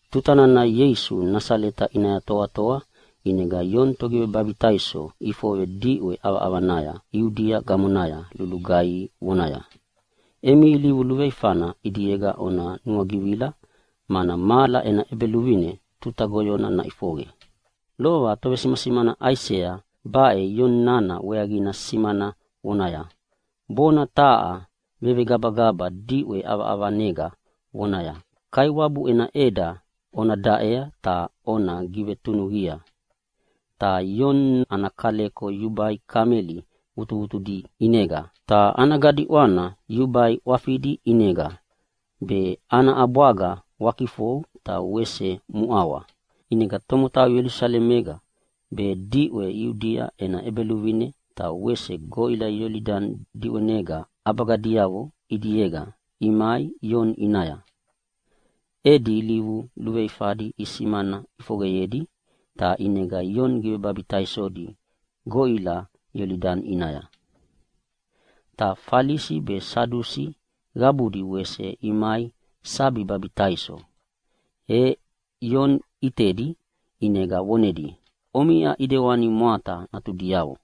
Tuta nana Ieisu Nasaleta ʼinaya toatoa, ʼinega Ioni Togivebabitaiso ʼifoqe diʼwe ʼavaʼavanaya Iudia gamonaya lugaihi vonaya, “Emi ilivu luveifana ʼidiega ona nuagivila, mana mahala ena ʼEbeluvine tuta goyona naʼifoqe.” Lova tovesimasimana Aisea baʼe Ioni nana weaqina simana vonaya, “Bona taha vevegabagaba diʼwe ʼavaʼavanega vonaya, ‘Kaiwabu ena ʼeda ona daʼea ta ona givetunuqia.’” Ta Ioni ana kaleko yubai kameli vutuvutudi ʼinega, ta ana gadiʼwana yubai ʼwafidi ʼinega, be ana ʼabwagayavo wakifou ta wese muʼawa. ʼInega tomotau Ielusalemega, be diʼwe Iudia ena ʼebeluvineyega ta wese goʼila Iolidani diʼwenega ʼabagadiavo ʼidiega imai Ioni ʼinaya. E edi ilivu luveifadi isimana ʼifoqeyedi ta ʼinega Ioni givebabitaisodi goʼila Iolidani ʼinaya. Ta Falisi be Sadusi qabudi wese imai sabi babitaiso, e Ioni ʼitedi ʼinega vonedia, “Omiʼa ʼidewani mwata natudiavo!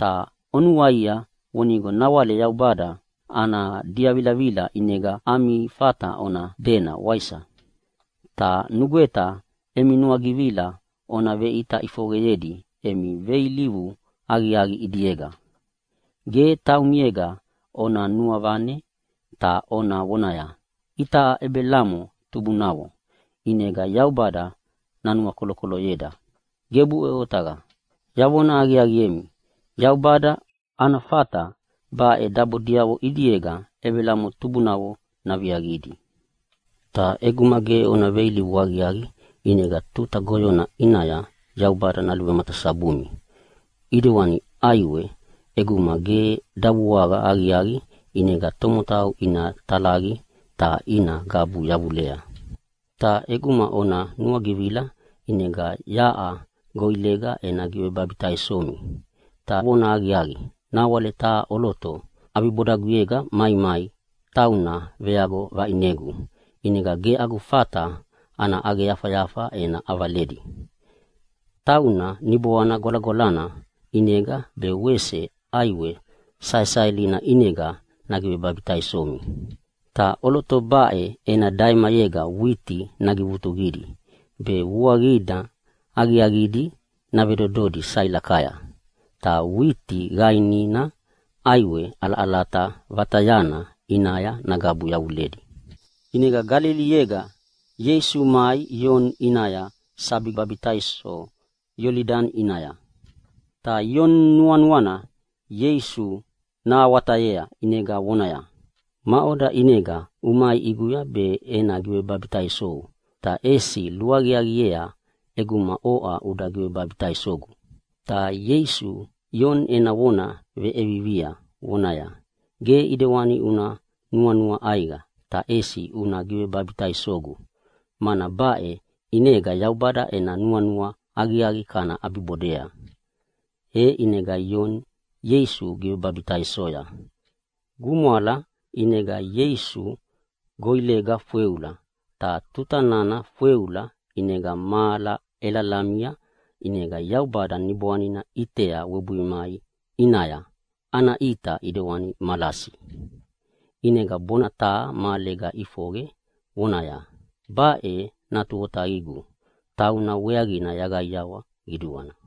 Ta onuaia vonigo nawale Yaubada ana diavilavila ʼinega ami fata ona dena, waisa? Ta nugweta emi nuagivila ona veʼita ʼifoqeyedi emi veilivu aqiaqi ʼidiega. Ge taumiega ona nuavane ta ona vonaya, ‘Itaʼa Ebelamo tubunavo, ʼinega Yaubada nanuakolokoloyeda.’ Gebuʼe otaqa! Yavona aqiaqiemi, Yaubada ana fata baʼe dabodiavo ʼidiega Ebelamo tubunavo naviaqidi. Ta ʼeguma ge ona veilivu aqiaqi, ʼinega tuta goyona ʼinaya Yaubada naluvematasabumi. ʼIdewani ʼaiwe, ʼeguma ge davuaqa aqiaqi ʼinega tomotau ina talaqi ta ina gabu yavulea. “Ta ʼeguma ona nuagivila ʼinega yaʼa goʼilega ena givebabitaisomi. Ta vonahaqiaqi, nawale taha ʼoloto ʼabibodaguyega maimai, tauna veago vaʼinegu, ʼinega ge agu fata ana ʼaqeyafayafa ena ʼavaledi. Tauna Niboana Gwalagwalana ʼinega be wese ʼaiwe saesaelina ʼinega nagivebabitaisomi. Ta ʼoloto baʼe ena daimayega witi nagivutuqidi be vuaqina aqiaqidi navedododi sailakaya, ta witi qainina ʼaiwe ʼalaʼalata vatayana ʼinaya nagabu yavuledi.” ʼInega Galiliega Ieisu mai Ioni ʼinaya sabi babitaiso Iolidani ʼinaya. Ta Ioni nuanuana Ieisu nahawatayea ʼinega vonaya, “Maʼoda ʼinega umai ʼiguya be ena givebabitaisou, ta ʼesi luaqiaqiea ʼeguma oʼa uda givebabitaisogu?” Ta Ieisu Ioni ena vona veʼevivia vonaya, “Ge ʼidewani una nuanua ʼaiqa ta ʼesi una givebabitaisogu, mana baʼe ʼinega Yaubada ena nuanua aqiaqi kana ʼabibodea.” E ʼinega Ioni Ieisu givebabitaisoya. Gumwala, ʼinega Ieisu goʼilega fweula, ta tuta nana fweula ʼinega mahala ʼelalamia, ʼinega Yaubada Niboanina ʼitea webuwebui mai ʼinaya, ana ʼita ʼidewani malasi. ʼInega bona taha mahalega ʼifoqe vonaya, “Baʼe Natu Otaqigu. Tauna weaqina yaqaiawa qiduana.”